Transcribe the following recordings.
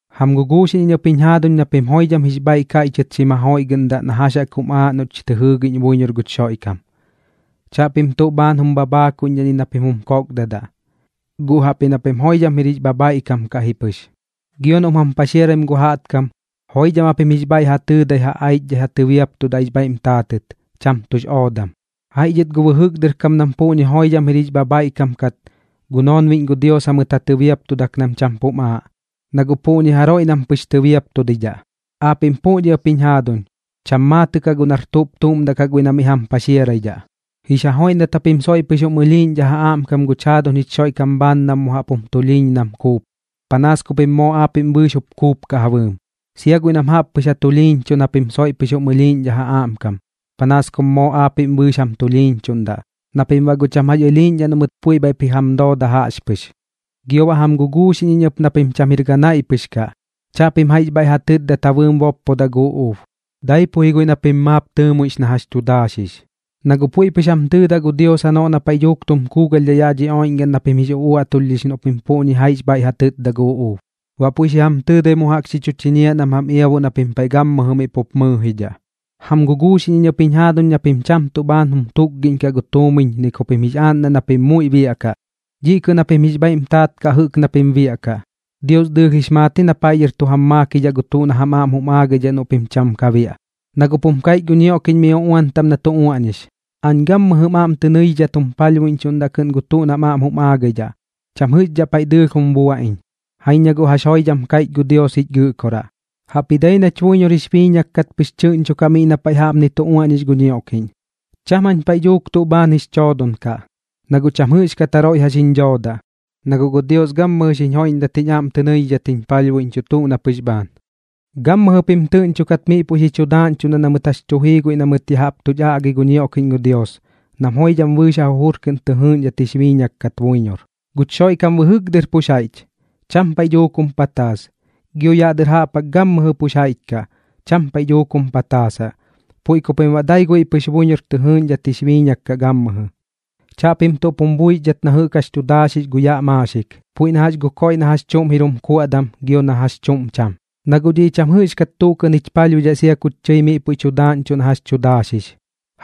Jam guguuxiꞌñ iñ ɨp jiñ jaaduñ na pim joidham jix bhaiꞌ kaiꞌchɨt xim jajoiꞌgɨꞌndaꞌ na jax jaꞌk jum aaꞌ noꞌch tɨ jɨɨgiꞌñ buiñor guch Xoiꞌkam. Chaꞌpim tuꞌ bhaan jum bhabhaakuidhaꞌ ni na pim jum kokdadaꞌ, guꞌ jaꞌpji na pim joidham jir jix bhabhaiꞌkam kaꞌ ji pɨx. Gio noꞌm jam paxiaraim gu jaꞌtkam, joidham japim jix bhaiꞌ ja tɨɨdai ja aichdhai ja tɨbiaptudaꞌ jix bhaiꞌm taatɨt, cham tuꞌx oodam. Jaiꞌ dhɨt gu bɨjɨk dɨr kam nam puꞌñi joidham jir jix bhabhaiꞌkam kat, gu noonbiꞌñ gu Dios jamɨt ja tɨbiaptudak nam cham pum aaꞌ, na guꞌ puꞌñi jaroiꞌ nam pɨx tɨbiaptudidhaꞌ. Aapiꞌm puꞌñi ɨp jiñ jaaduñ, cham maatɨꞌ kaꞌ guꞌ nar tuꞌp tuꞌm daꞌ kaꞌ guiꞌ na miꞌ jam paxiaraidhaꞌ. Jix ja joiꞌndat japim soiꞌ pɨx jum ɨlhiiꞌñdhaꞌ ja aꞌmkam guch jaaduñ jich Xoiꞌkam bhaan nam jum tulhiiñ mu nam kuup, panaas ku pim moo aapiꞌm bɨɨx mup kuupkaꞌ ja bɨɨm. Sia guiꞌ nam jaꞌp pɨx ja tulhiiñchuꞌn japim puiꞌ soiꞌp jum ɨlhiiꞌñdhaꞌ ja aꞌmkam, panaas kum moo aapiꞌm bɨɨx jup jam tulhiiñchuꞌndaꞌ, na pim baꞌ guꞌ cham jax ɨlhiiꞌñdhaꞌ noꞌ mɨt puiꞌ bhaiꞌp ji jam dooda jaꞌxpɨx. Gio baꞌ jam guguuxiꞌñ iñ ɨp na pim cham jir ganaiꞌ pɨx kaꞌ. Chaꞌpim jaiꞌx bhaiꞌ ja tɨtdadat ja bɨɨm boppodaꞌ gu uꞌuub, dai ji guiꞌ na pim maap tɨɨmuiꞌx na jax tu daaxix. Na guꞌ puiꞌ pɨx jam tɨɨdaꞌ gu Dios janoꞌ na paiꞌ dhuuk tum kuugalhdhaꞌ yaꞌ dhi oiꞌñgaꞌn na pim jix uꞌuaꞌtulhdhix noꞌ pim puꞌñi jaiꞌx bhaiꞌ ja tɨtda gu uꞌuub. Baꞌ puiꞌ xi jam tɨɨdai mu jaꞌk xi chu chiñiaꞌ nam jam iabuꞌ na pim paiꞌ gammɨjɨ miꞌ pup mɨɨjidhaꞌ. Jam guguuxiꞌñ iñ ɨp jiñ jaaduñ na pim cham tuꞌ bhaan jum tutkagiꞌñkaꞌ gu tuumiñ ni ku pim jix aaꞌndaꞌ na pim muiꞌ biaꞌkaꞌ. Dhiꞌ kɨꞌn japim jix bhaiꞌm taat kaꞌ jɨꞌk na pim biaꞌkaꞌ. Dios dɨɨlh jix maat na paiꞌ dhɨr tu jam maakidhaꞌ gu tuꞌ na jam aꞌm jum aagaidhaꞌ noꞌ pim cham ka biaꞌ, na guꞌp jum kaiꞌch gu ñioꞌkiꞌñ miꞌ uꞌuan taꞌm na tu uaꞌñix: “Aañ gammɨjɨm aꞌm tɨ nɨidhidhat jum palhbuiꞌñchuꞌndaꞌ kɨꞌn gu tuꞌ nam aꞌm jum aagaidhaꞌ. Cham jɨꞌxdhaꞌ paiꞌ dhuuk dɨɨlh jum buaꞌ iñ.” Jaiñ na guꞌ jax pɨk joidham kaiꞌch gu Dios jich Gɨꞌkoraꞌ, jaꞌpji dai nach buiñor jix biiñak kat pɨx tɨꞌñchokaꞌ miꞌ jaꞌk na paiꞌ jaꞌpnip tu uaꞌñix gu ñioꞌkiꞌñ: Cham jañ paiꞌ dhuuk tuꞌ bhaan jix choodon kaꞌ, na guꞌ cham jɨꞌxkat jaroiꞌ jax jiñ dhoodaꞌ, na guꞌ gu Dios gammɨjɨ xiñ joiꞌndat jiñ aꞌm tɨ nɨidhidhat jiñ palhbuiꞌñchuꞌ tuꞌ na pɨx bhaan. Gammɨjɨ pim tɨꞌñchokat miꞌ puiꞌ xi chu daaꞌñchuꞌndaꞌ na mɨt jax tu jii guiꞌ na mɨt ya jaꞌp tuch aꞌgi gu ñioꞌkiꞌñ gu Dios, nam joidham bɨɨx ja jujur kɨꞌn tɨ jɨɨꞌñdhat jix biiñak kat buiñor. Guch Xoiꞌkam bɨjɨk dɨr pux jaiꞌch, cham paiꞌ dhuuk jum pataas. Gio yaꞌ dɨr jaꞌp jaꞌk gammɨjɨ pux jaiꞌch kaꞌ, cham paiꞌ dhuuk jum pataasaꞌ. Puiꞌ ku pim baꞌ dai guiꞌ pɨx buiñor tɨ jɨɨꞌñdhat jix biiñak kaꞌ gammɨjɨ. Chaꞌpim tuꞌp jum buixdhat na jɨꞌk jax tu daaxix gu yaꞌ maaxik, puiꞌ na jax gu koiꞌ na jax chuꞌm jir jum kuaꞌdam gio na jax chuꞌm cham. Na guꞌ dhiꞌ cham jɨꞌxkat tuꞌ kɨꞌn jich palhbuidhaꞌ sia kuch tɨi miꞌ puiꞌ tu daaꞌñchuꞌ na jax tu daaxix.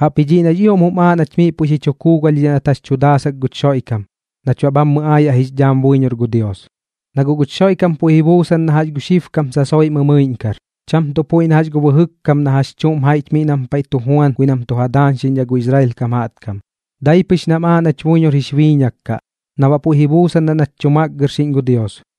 Jaꞌpji dhiꞌ nax ioꞌm jum aaꞌ nach miꞌ puiꞌ xi chu kuugalhdhidhaꞌ nat jax tu daasak guch Xoiꞌkam, nach baꞌ bhammɨ aayaꞌ jix dhaam buiñor gu Dios. Na guꞌ guch Xoiꞌkam puiꞌ ji buusan na jax gu xibkam sasoiꞌ mɨmɨiꞌñkar, cham tuꞌ puiꞌ na jax gu bajɨk kam na jax chuꞌm jaiꞌch miꞌ nam paiꞌ tu juan guiꞌ nam tu ja daañxiꞌñdhaꞌ gu Israel kam jaꞌtkam. Dai pɨx nam aaꞌ nach buiñor jix biiñak kaꞌ, na baꞌ puiꞌ ji buusandaꞌ nach tu makgɨrxiꞌñ gu Dios.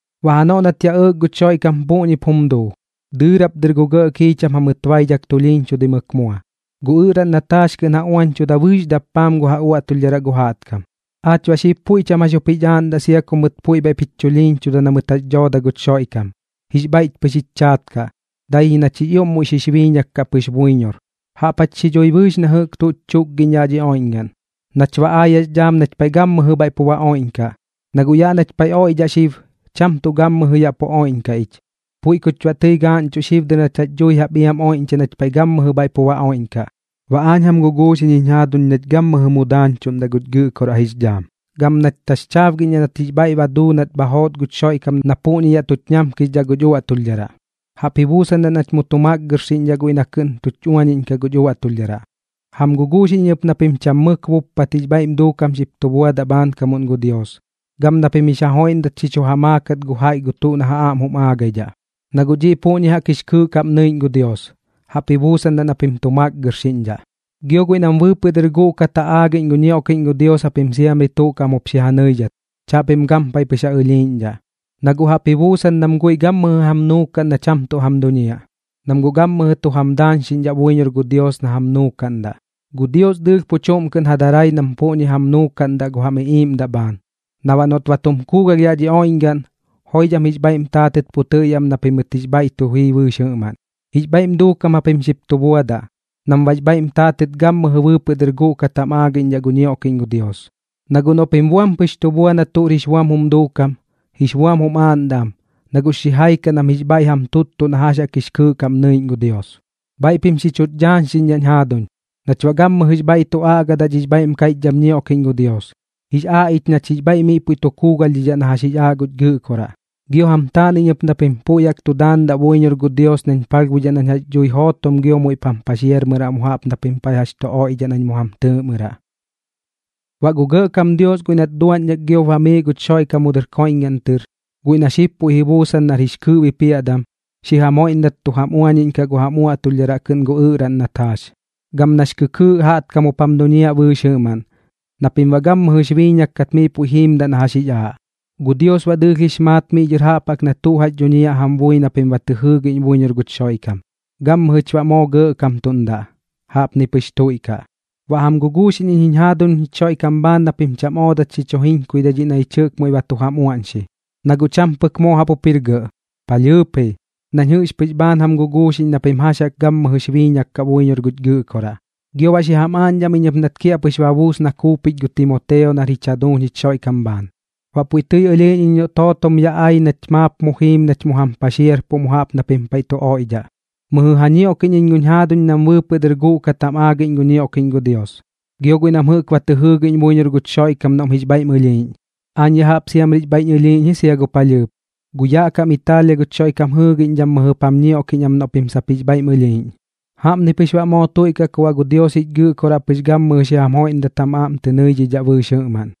Baꞌ janoꞌ nat yaꞌ ɇɇk guch Xoiꞌkam puꞌñip jum duu, dɨɨrap dɨr gu gɇꞌ kiicham jamɨt baidhak tulhiiñchudimɨk mua, gu ɨꞌraꞌn nat jaax kɨꞌn ja uañchuda bɨɨx dappaam gu ja uaꞌtulhdharaꞌ gu jaꞌtkam. Aach baꞌ xib puiꞌ cham jax jup jich aaꞌndaꞌ sia ku mɨt puiꞌ bhaiꞌp jich chulhiiñchudaꞌ na mɨt jax dhooda guch Xoiꞌkam, jix bhaiꞌch pɨx jix chaat kaꞌ, dai ji nach jix ioꞌm muiꞌ xix biiñak kaꞌ pɨx buiñor, jaꞌp jach xi dhui bɨɨx na jɨꞌk tuch chukgiꞌñ yaꞌ dhi oiꞌñgaꞌn, nach baꞌ aayaꞌx dhaam nach paiꞌ gammɨjɨ bhaiꞌ pu ba oiꞌñkaꞌ. Na guꞌ yaꞌ nach paiꞌ oiꞌdhaꞌ xib cham tuꞌ gammɨjɨ yaꞌ pu oiꞌñkaꞌ ich, puiꞌ kuch baꞌ tɨi gaaꞌñchuꞌ xib dɨr nach jax dhui jaꞌp iam oiꞌñchaꞌ nach paiꞌ gammɨjɨ bhaiꞌ pu ba oiꞌñkaꞌ. Baꞌ aañ jam guguuxiꞌñ jiñ jaaduñ nach gammɨjɨ mu daañchuꞌndaꞌ guch Gɨꞌkoraꞌ jix dhaam, gam nach taxchaabgiꞌñdhaꞌ nat jix bhaiꞌ ba duu nat bha joot guch Xoiꞌkam na puꞌñi yaꞌ tuch ñamkixdhaꞌ guch uaꞌtulhdharaꞌ, jaꞌp ji buusandaꞌ nach mu tu makgɨrxiꞌñdhaꞌ guiꞌ na kɨꞌn tuch uañiꞌñkaꞌ guch uaꞌtulhdharaꞌ. Jam guguuxiꞌñ iñ ɨp na pim cham mɨk buppat jix bhaiꞌm duukam xip tu buadaꞌ bhaankamuꞌn gu Dios, gam na pim jix ja joiꞌndat xi chu ja maakat gu jaiꞌ gu tuꞌ noꞌ ja aꞌm jum aagaidhaꞌ, na guꞌ dhiꞌ puꞌñi jaꞌk jix kɨɨꞌ kaꞌm nɨiꞌñ gu Dios, jaꞌp ji buusandaꞌ na pim tu makgɨrxiꞌñdhaꞌ. Gio guiꞌ nam bɨɨpɨꞌ dɨr guꞌkat jam aagiꞌñ gu ñioꞌkiꞌñ gu Dios japim siamri tuꞌ kaꞌm jup xi ja nɨidhat, chaꞌpim gampaiꞌ pɨx ja ɨlhiiꞌñdhaꞌ. Na guꞌ jaꞌp ji buusan nam guiꞌ gammɨjɨ jam nuukaꞌn na cham tuꞌ jam duñiaꞌ, nam guꞌ gammɨjɨ tu jam daañxiꞌñdhaꞌ buiñor gu Dios na jam nuukaꞌndaꞌ. Gu Dios dɨɨlh pu chuꞌm kɨꞌn ja darai nam puꞌñi jam nuukaꞌndaꞌ gu jam iꞌiiꞌmdaꞌ bhaan, na baꞌ noꞌt ba tum kuugalh yaꞌ dhi oiꞌñgaꞌn, joidham jix bhaiꞌm taatɨt pu tɨꞌyaꞌ am na pimɨt jix bhaiꞌ tu jii bɨɨx jɨꞌmaꞌn. Jix bhaiꞌm duukam japim xip tu buadaꞌ, nam baꞌx bhaiꞌm taatɨt gammɨjɨ bɨɨpɨꞌ dɨr guꞌkat jam aagiꞌñdhaꞌ gu ñioꞌkiꞌñ gu Dios. Na guꞌ noꞌ pim buam pɨx tu bua na tuꞌr jix buam jum duukam, jix buam jum aaꞌndaꞌ am, na guꞌx xijai kaꞌ nam jix bhaiꞌ jam tuttuꞌ na jax jaꞌk jix kɨɨꞌ kaꞌm nɨiꞌñ gu Dios. Bhaiꞌ pim xi chuch dhaañxiꞌñdhaꞌñ jaaduñ, nach baꞌ gammɨjɨx bhaiꞌ tu aꞌgadaꞌ dhix bhaiꞌm kaiꞌchdham ñioꞌkiꞌñ gu Dios. Jix aaꞌ ich nach jix bhaiꞌ miꞌ puiꞌ tu kuugalhdhidhaꞌ na jax jix aaꞌ guch Gɨꞌkoraꞌ. Gio jam taan iñ ɨp na pim puiꞌ jaꞌk tu daandaꞌ buiñor gu Dios nañ palhbuidhaꞌ nañ jax dhui jootom gio muiꞌp jam paxiarmɨraꞌ mu jaꞌp na pim jax tu oiꞌdhaꞌ nañ mu jam tɨɨꞌmɨraꞌ. Baꞌ gu Gɇꞌkam Dios guiꞌ nat duaꞌñdhak giop bamiiꞌ guch Xoiꞌkam mu dɨr koiꞌñgaꞌn tɨr, guiꞌ na xib puiꞌ ji buusan nar jix kɨɨꞌ bipiaꞌdam, xi jam joiꞌndat tu jam uañiꞌñkaꞌ gu jam uaꞌtulhdharaꞌ kɨꞌn gu ɨꞌraꞌn nat jaax, gam nax kɨkɨɨꞌ jaꞌtkam jup jam duñiaꞌ bɨɨx jɨꞌmaꞌn, na pim baꞌ gammɨjɨx biiñak kat miꞌ puiꞌ jiimdaꞌ na jax jix aaꞌ. Gu Dios baꞌ dɨɨlh jix maat miꞌ dhɨr jaꞌp jaꞌk na tuꞌ jax dhuñiaꞌ jam bui na pim ba tɨ jɨɨgiꞌñ buiñor guch Xoiꞌkam. Gammɨjɨch baꞌ moo gɇꞌkamtuꞌndaꞌ. Jaꞌpni pɨx tuiꞌkaꞌ. Baꞌ jam guguuxiꞌñ iñ jiñ jaaduñ jich Xoiꞌkam bhaan na pim cham oodat xi chu jiñkuidhai dhiꞌ na ñich muiꞌ ba tu jam uaꞌñxi, na guꞌ cham pɨk moo jaꞌp jup jir gɇꞌ, palhɨɨp ji, nañ jɨꞌx pɨx bhaan jam guguuxiꞌñ na pim jax jaꞌk gammɨjɨx biiñak kaꞌ buiñor guch Gɨꞌkoraꞌ. Gio baꞌ xi jam aaꞌñdham iñ ɨp nat kiaꞌpɨx ba buus na kuupich gu Timoteo nar jich jaduuñ jich Xoiꞌkam bhaan. Baꞌ puiꞌ tɨi ɨlhiiꞌñ iñ noꞌt jootom yaꞌ ai nach maap mu jiim nach mu jam paxiarpuꞌ mu jaꞌp na pim paiꞌ tu oiꞌdhaꞌ. Mɨjɨ ja ñioꞌkiꞌñ iñ guñ jaaduñ nam bɨɨpɨꞌ dɨr guꞌkat jam aagiꞌñ gu ñioꞌkiꞌñ gu Dios, gio guiꞌ nam jɨꞌk ba tɨ jɨɨgiꞌñ buiñor guch Xoiꞌkam noꞌm jix bhaiꞌm ɨlhiiꞌñ. Aañ ya jaꞌp siamri jix bhaiꞌñ ɨlhiiꞌñ ji sia gu palhɨɨp. Gu yaꞌ kam Itaalia guch Xoiꞌkam jɨɨgiꞌñdham mɨjɨp xi jam ñioꞌkiꞌñ am noꞌ pim sap jix bhaiꞌm ɨlhiiꞌñ. Jaꞌpni pɨx baꞌ moo tuiꞌkaꞌ ku baꞌ gu Dios jich Gɨꞌkoraꞌ pɨx gammɨjɨ xi jam joiꞌndat jam aꞌm tɨ nɨidhidhaꞌ bɨɨx jɨꞌmaꞌn.